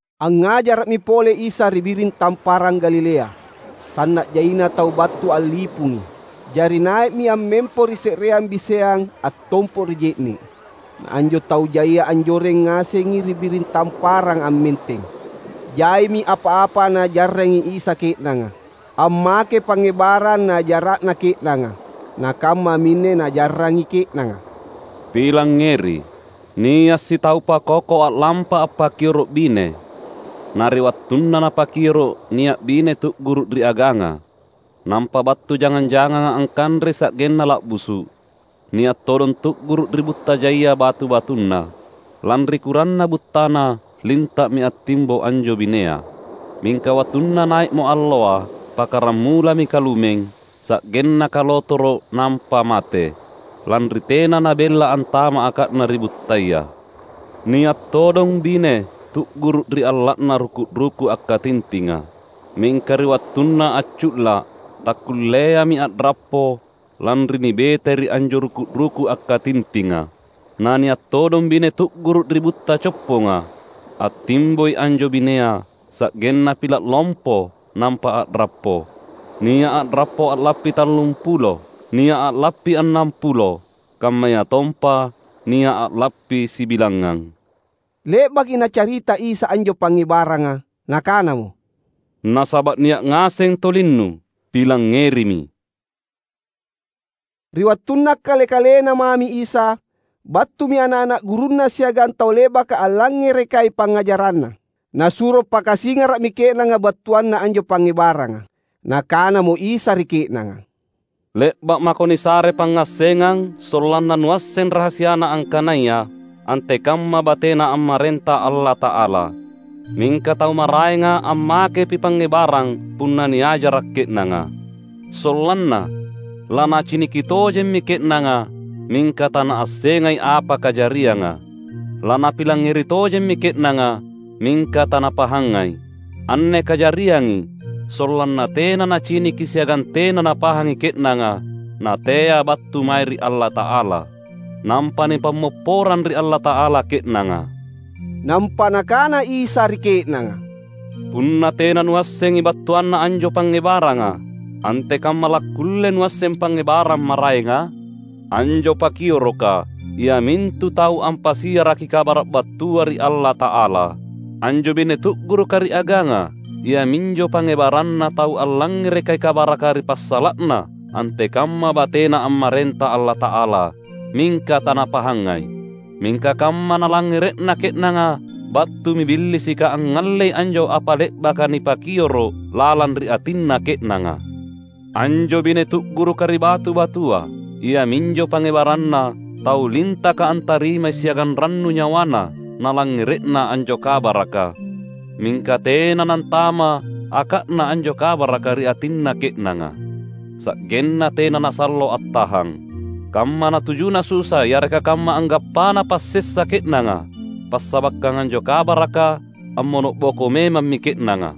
Angngajara’mi pole Isa ri biring Tamparang Galilea. Sanna’ jaina tau battu allipungi. Jari nai’mi ammempo ri se’reang biseang attompo’ ri je’ne’. Na anjo tau jaia anjoreng ngasengi ri biring tamparanga ammenteng. Jaimi apa-apa Naajarrangi Isa ke’nanga. Ammakei pangngebarang Naajara’na ke’nanga. Na kammaminne Naajarrangi ke’nanga. "Pilangngeri! Nia’ sitau pakoko a’lampa appakioro’ bine. Na ri wattunna napakioro’, nia’ bine tu’guru’ ri aganga. Nampa battu jangang-janganga angkanrei sa’genna la’busu’. Nia’ todong tu’guru’ ri butta jaia batu-batunna. Lanri kuranna buttana linta’mi attimbo anjo binea; mingka wattunna nai’mo alloa pakkaramulami kalumeng, sa’genna kalotoro’ nampa mate, lanri tena nabella antama’ aka’na ri buttaya. Nia’ todong bine tu’guru’ ri alla’na ruku’-ruku’ akkatintinga. Mingka ri wattunna accu’la’, takkulleami a’rappo lanri nibetai ri anjo ruku’-ruku’ akkatintinga. Na nia’ todong bine tu’guru’ ri butta copponga. Attimboi anjo binea, sa’genna pila’ lompo nampa a’rappo. Nia’ a’rappo a’lappi tallumpulo, nia’ a’lappi annampulo, kammayatompa nia’ a’lappi sibilangngang." Le’baki Nacarita Isa anjo pangngebaranga, Nakanamo, "Nasaba’ nia’ ngaseng tolinnu, pilangngerimi!" Ri wattunna Kale-kalenNa mami Isa, battumi ana’-ana’ gurunNa siagang tau le’baka allangngerekai pangngajara’Na. Nasuro pakasingara’mi ke’nanga battuanna anjo pangngebaranga. Nakanamo Isa ri ke’nanga, "Le’ba’ mako nisare pangngassengang sollanna nuasseng rahasiana angkanaya antekamma batena ammarenta Allata’ala. Mingka tau maraenga ammakepi pangngebarang punna niajara’ ke’nanga, sollanna ‘Lanaciniki tojemmi ke’nanga, mingka tanaassengai apa kajarianga, lanapilangngeri tojemmi ke’nanga, mingka tanapahangai, anne kajariangi sollanna tena naciniki siagang tena napahangi ke’nanga na tea battu mae ri Allata’ala, nampa nipammopporang ri Allata’ala ke’nanga.’" Nampa Nakana Isa ri ke’nanga, "Punna tena nuassengi battuanna anjo pangngebaranga, antekamma lakkulle nuasseng pangngebarang maraenga? Anjo pakioroka, iamintu tau ampasiaraki Kabara’ battua ri Allata’ala. Anjo bine tu’guruka ri aganga, iaminjo pangngebaranna tau allangngerekai kabaraka ri passala’na antekamma batena ammarenta Allata’ala, mingka tanapahangai. Mingka kamma nalangngere’na ke’nanga battumi Billisika angngallei anjo apa le’baka nipakioro’ lalang ri atinna ke’nanga. Anjo bine tu’guruka ri batu-batua, iaminjo pangngebaranna tau lintaka antarimai siagang rannu nyawana nalangngere’na anjo kabaraka. Mingka tena nantama’ aka’na anjo kabaraka ri atinna ke’nanga, sa’genna tena nasallo attahang. Kamma natujuna susa yareka kamma anggappana passessa ke’nanga passabakkang anjo kabaraka, ammono’boko memammi ke’nanga.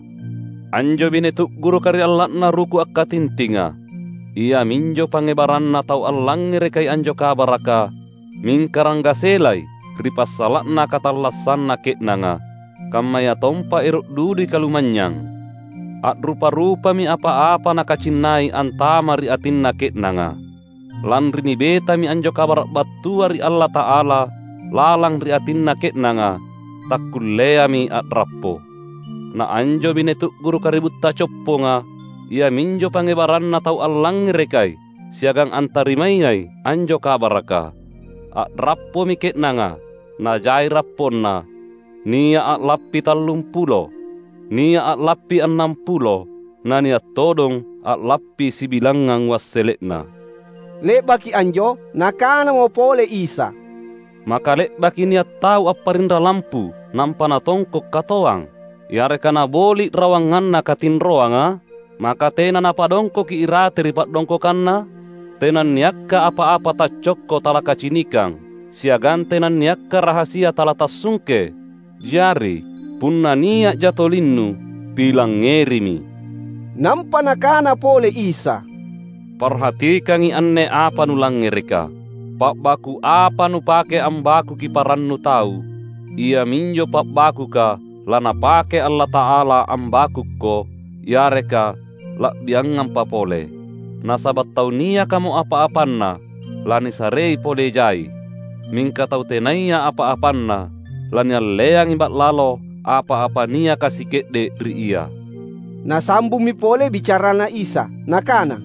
Anjo bine tu’guruka ri alla’na ruku’ akkatintinga, iaminjo pangngebaranna tau allangngerekai anjo kabaraka, mingka ranggaselai ri passala’na katallassanna ke’nanga, kammayatompa ero’ dudui kalumanynyang. A’rupa-rupami apa-apa nakacinnai antama’ ri atinna ke’nanga. Lanri nibetami anjo kabara’ battua ri Allata’ala lalang ri atinna ke’nanga, takkulleami a’rappo. Na anjo bine tu’guruka ri butta copponga, iaminjo pangngebaranna tau allangngerekai siagang antarimayai anjo kabaraka. A’rappomi ke’nanga, na jai rapponna: nia’ a’lappi tallumpulo, nia’ a’lappi annampulo, na nia’ todong a’lappi sibilangngang wassele’na." Le’baki anjo Nakanamo pole Isa, "Maka le’baki nia’ tau apparinra lampu nampa natongko’ katoang, yareka naboli’ rawanganna katinroanga? Maka tena napadongkoki irate ri pa’dongkokanna? Tenanniakka apa-apa taccokko talakacinikang; siagang tenanniakka rahasia talatassungke. Jari, punna nia’ja tolinnu, pilangngerimi!" Nampa Nakana pole Isa, "Parhatikangi anne apa nulangngereka. Pa’baku’ apa nupake ambakuki parannu tau, iaminjo pa’bakuka laNapake Allata’ala ambakukko — yareka la’biangampa pole. Nasaba’ tau niakamo apa-apanna, lanisarei pole jai; mingka tau tenaya apa-apanna, lanialleangi ba’lalo apa-apa niaka sike’de’ ri ia." Nasambummi pole bicaranNa Isa Nakana,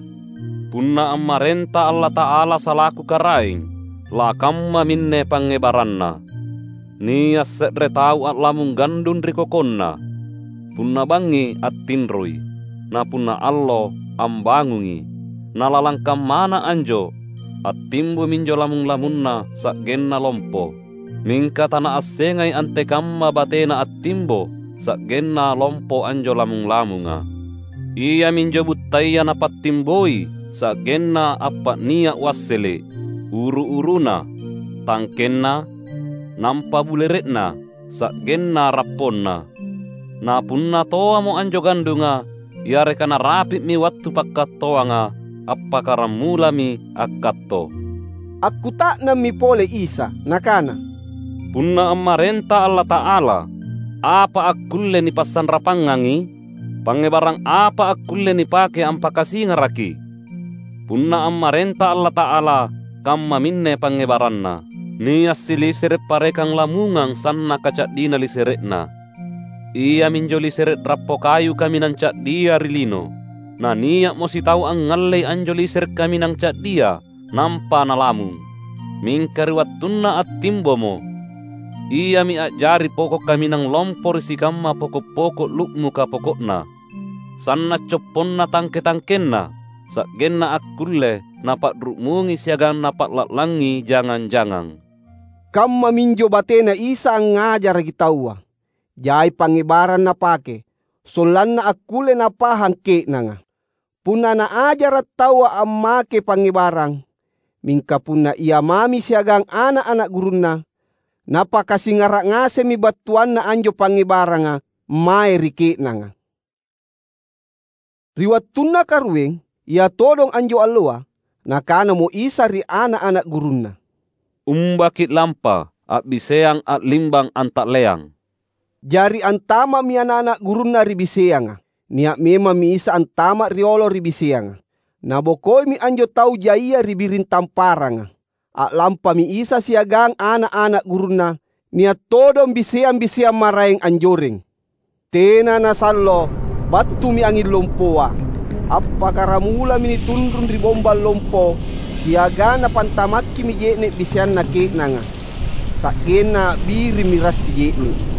"Punna ammarenta Allata’ala salaku Karaeng, lakammaminne pangngebaranna. Nia’ se’re tau a’lamung gandung ri kokonna. Punna bangngi attinroi; na punna allo ambangungi. Na lalang kammana anjo attimbo minjo lamung-lamunna sa’genna lompo. Mingka tanaassengai antekamma batena attimbo sa’genna lompo anjo lamung-lamunga. Iaminjo buttaya napattimboi sa’genna appa’nia’ wassele’: uru-uruna tangkenna, nampa bulere’na sa’genna rapponna. Na punna toamo anjo gandunga yareka narapi’mi wattu pakkattoanga, appakkaramulami akkatto." Akkuta’nammi pole Isa Nakana, "Punna ammarenta Allata’ala, apa akkulle nipasanrapangangi? Pangngebarang apa akkulle nipake ampakasingaraki? Punna ammarenta Allata’ala kammaminne pangngebaranna: Nia’ silisere’ parekang lamungang sannaka ca’dina lisere’na. Iaminjo lisere’ rappo kayu kaminang ca’dia ri lino. Na nia’mo sitau angngallei anjo lisere’ kaminang ca’dia, nampa nalamung. Mingka ri wattunna attimbomo, iami a’jari poko’ kaminang lompo ri sikamma poko’-poko’ lu’muka poko’na. Sanna’ copponna tangke-tangkenna, sa’genna akkulle napa’ru’mungi siagang napa’la’langi jangang-jangang." Kammaminjo bateNa Isa angngajaraki taua. Jai pangngebarang Napake, sollanna akkulle napahang ke’nanga. Punna Naajara’ taua ammakei pangngebarang. Mingka punna Ia mami siagang ana’-ana’ gurunNa, Napakasingara’ ngasemmi battuanna anjo pangngebaranga mae ri ke’nanga. Ri wattunna karueng, ia todong anjo alloa, Nakanamo Isa ri ana’-ana’ gurunNa, "Umba ki’lampa a’biseang a’limbang anta’leang." Jari antama’mi ana’-ana’ gurunNa ri biseanga. Nia’ memammi Isa antama’ riolo ri biseanga. Nabokoimi anjo tau jaia ri biring tamparanga. A’lampami Isa siagang ana’-ana’ gurunNa. Nia’ todong biseang-biseang maraeng anjoreng. Tena nasallo, battumi anging lompoa. Appakkaramulami nitunrung ri bombang lompo siagang napantamakkimi je’ne’ biseanna ke’nanga, sa’genna a’birimmi rassi je’ne’.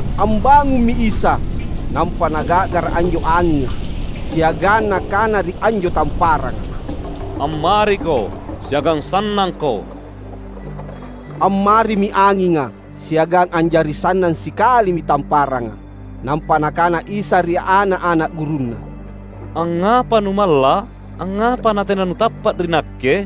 Ambangummi Isa, nampa naga’gara’ anjo anginga, siagang Nakana ri anjo tamparanga, "Ammariko siagang sannangko!" Ammarimi anginga, siagang a’jari sannang sikalimi tamparanga. Nampa Nakana Isa ri ana’-ana’ gurunNa, "Angngapa numalla’? Angngapa natena nutappa’ ri Nakke?"